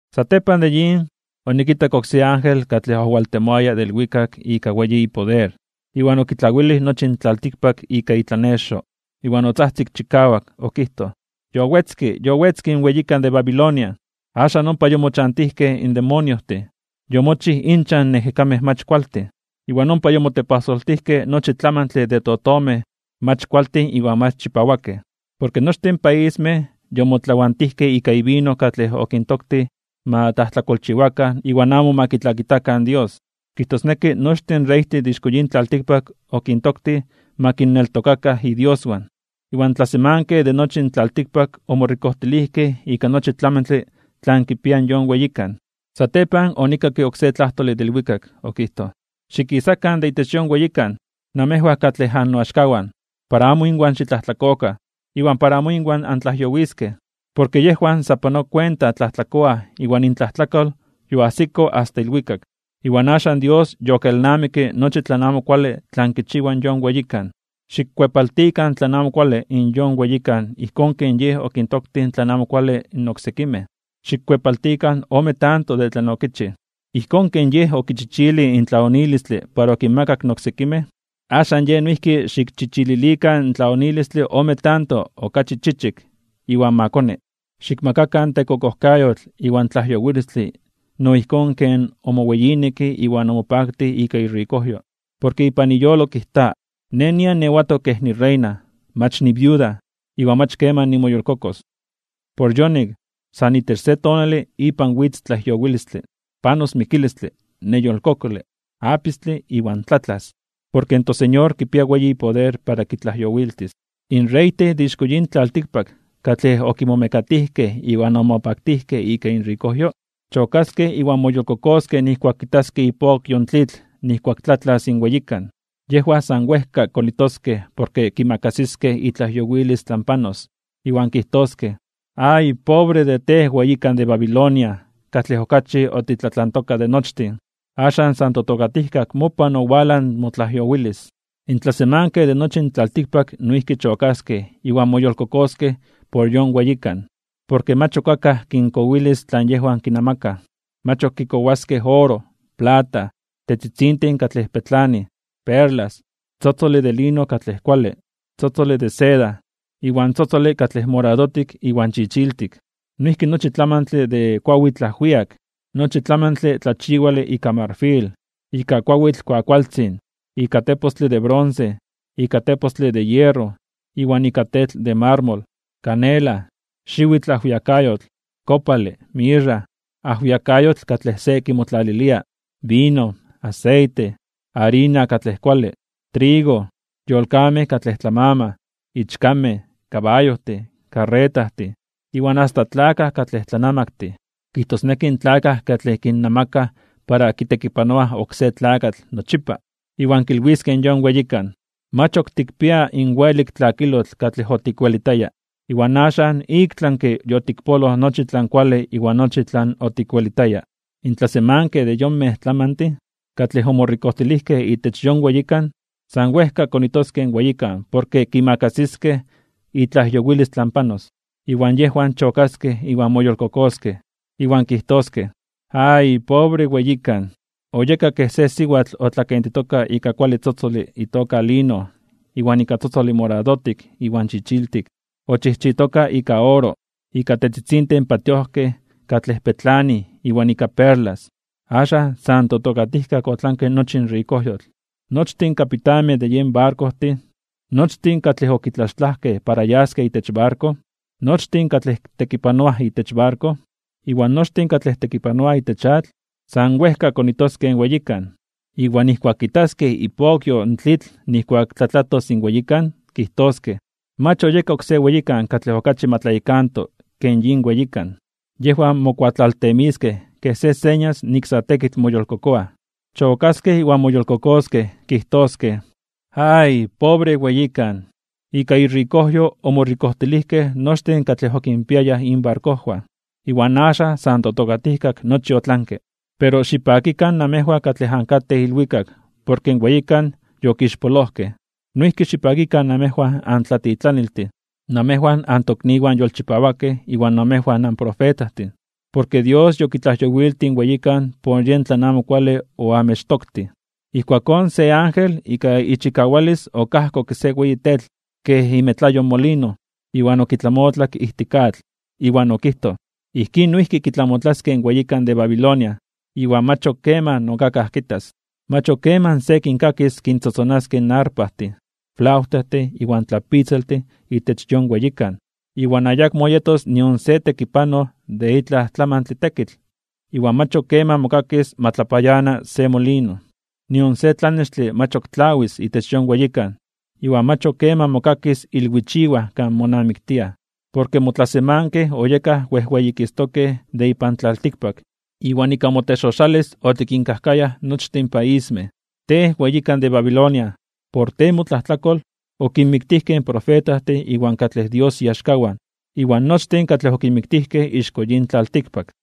Satepan de yin, onikitak oksé ángel katlej owaltemoaya de ilwikak ika weyi ipoder. Iwan okitlawilij nochi in tlaltikpak ika itlanexo. Iwan otzajtzik chikawak, okijtoj: ―Yowetzke, yowetzke in weyikan de Babilonia, axan ompa yomochantijkej in demoniojtin, yomochij inchan in ejekamej mach kualtin, iwan ompa yomotepajsoltijkej nochi tlamantle de totomej mach kualtin iwan mach chipawakej. Porke nochtin in paismej yomotlawantijkej ika ivino katlej okintoktij ma tlajtlakolchiwakan iwan amo ma kitlakitakan Dios. Kijtosneki nochtin in reytin de ixko yin tlaltikpak okintoktij ma kinneltokakan idioswan. Iwan tlasemankej de nochi in tlaltikpak omorikojtilijkej ika nochi tlamantle tlan kipia in yon weyikan. Satepan onikakke oksé tlajtole de ilwikak, okijtoj: ―Xikisakan de itech yon weyikan, namejwan katlej annoaxkawan, para amo inwan xitlajtlakokan, iwan para amo inwan antlajyowiskej. Porke yejwan sa panoa kuenta tlajtlakoaj iwan intlajtlakol yoajsito asta ilwikak. Iwan axan Dios yokelnamikke nochi tlan amo kuale tlan kichiwa yon weyikan. Xikkuepaltikan tlan amo kuale in yon weyikan ijkón ken yej okintoktij tlan amo kuale in oksekimej. Xikkuepaltikan ome tanto de tlan okichij. Ijkón ken yej okichichilij in tlaonilistle para okinmakak in oksekimej, axan yej noijki xikchichililikan in tlaonilistle ome tanto okachi chichik iwan ma koni. Xikmakakan tekokojkayotl iwan tlajyowilistle no ijkón ken omoweyineke iwan omopaktij ika irikojyo. Porke ipan iyolo kijta: “Nej nian niewatok kej nireina, mach niviuda, iwan mach keman nimoyolkokos.” Por yonik, san itech se tonale ipan witz tlajyowilistle. Panos mikilistle, neyolkokole, apistle iwan tlatlas. Porke in toSeñor kipia weyi ipoder para kitlajyowiltis. In reytin de ixko yin tlaltikpak katlej okimomekatijkej iwan omopaktijkej ika inrikojyo, chokaskej iwan moyolkokoskej nijkuak kitaskej ipokyo in tlitl nijkuak tlatlas in weyikan. Yejwan san wejka konitoskej porke kimakasiskej itlajyowilis tlan panos, iwan kijtoskej: ―¡Ay! Pobre de tej, weyikan de Babilonia katlej okachi otitlatlantoka de nochtin. Axan san totokatijkak mopan owalaj motlajyowilis. In tlasemankej de nochi in tlaltikpak noijki chokaskej iwan moyolkokoskej por yon weyikan, porke mach ok akaj kinkowilis tlan yejwan kinamakaj. Mach ok kikowaskej oro, plata, tetzitzintin katlej petlanij, perlas, tzotzole de lino katlej kuale, tzotzole de seda, iwan tzotzole katlej moradotik iwan chichiltik. Noijki nochi tlamantle de kuawitl ajwiak, nochi tlamantle tlachiwale ika marfil, ika kuawitl kuakualtzin, ika tepostle de bronce, ika tepostle de hierro iwan ika tetl de marmol, canela, xiwitl ajwiakayotl, kopale, mirra, ajwiakayotl katlej se kimotlalilia, vino, aseite, arina katlej kuale, trigo, yolkamej katlej tlamamaj, ichkamej, kabayojtin, karretajtin, iwan asta tlakaj katlej tlanamaktin, kijtosneki in tlakaj katlej kinnamakaj para kitekipanoaj oksé tlakatl nochipa. Iwan kilwiskej yon weyikan: ―Mach ok tikpia in welik tlakilotl katlej otikwelitaya. Iwan axan iktlanke (ik tlami) yotikpoloj nochi tlan kuale iwan nochi tlan otikwelitaya. In tlasemankej de yonmej tlamantin, katlej omorikojtilijkej itech yon weyikan, san wejka konitoskej in weyikan porke kimakasiskej itlajyowilis tlan panos, iwan yejwan chokaskej iwan moyolkokoskej. Iwan kijtoskej: ―¡Ay! Pobre weyikan. Oyeka kej se siwatl otlakentitoka ika kuale tzotzole itoka lino iwan ika tzotzole moradotik iwan chichiltik. Ochijchitoka ika oro, ika tetzitzintin patiojkej katlej petlanij iwan ika perlas. Axan san totokatijkak otlanke nochi in rikojyotl. Nochtin kapitanmej de yen barkojtin, nochtin katlej okitlaxtlajkej para yaskej itech barko, nochtin katlej tekipanoaj itech barko, iwan nochtin katlej tekipanoaj itech atl, san wejka konitoskej in weyikan. Iwan nijkuak kitaskej ipokyo in tlitl nijkuak tlatlatos in weyikan, kijtoskej: ―Mach oyeka oksé weyikan katlej okachi ma tlayekanto ke yin weyikan. Yejwan mokuatlaltemiskej kej se señas nik sa tekitl moyolkokoaj. Chokaskej iwan moyolkokoskej, kijtoskej: ―¡Ay! Pobre weyikan. Ika irikojyo omorikojtilijkej nochtin katlej okinpiayaj inbarkojwan. Iwan axan san totokatijkak nochi otlanke. Pero xipakikan namejwan katlej ankatej ilwikak porke in weyikan yokixpolojkej. Noijki xipakikan namejwan antlatitlaniltin, namejwan antokniwan yolchipawakej iwan namejwan anprofetajtin, porke Dios yokitlajyowiltij in weyikan por yen tlan amo kuale oamechtoktij. Ijkuakón se ángel ika ichikawalis okajkokke se weyi tetl kej imetlayo in molino, iwan okitlamotlak ijtik atl. Iwan okijtoj: ―Ijkín noijki kitlamotlaskej in weyikan de Babilonia, iwan mach ok keman akaj kitas. Mach ok keman se kinkakis kintzotzonaskej arpajtin, flautajtin iwan tlapitzaltin itech yon weyikan. Iwan ayakmo yetos nion se tekipanoj de itlaj tlamantle tekitl, iwan mach ok keman mokakis ma tlapayana se molino. Nion se tlanextle mach ok tlawis itech moweyikan, iwan mach ok keman mokakis ilwichiwaj kan monamiktiaj. Porke motlasemankej oyekaj wejweyikistokej (wejweyititokej) de ipan tlaltikpak, iwan ika motexoxalis (mobrujojkayo) otikinkajkayaj nochtin in paismej. Tej weyikan de Babilonia, por tej motlajtlakol, okinmiktijkej in profetajtin iwan katlej Dios iaxkawan, iwan nochtin katlej okinmiktijkej ixko yin tlaltikpak.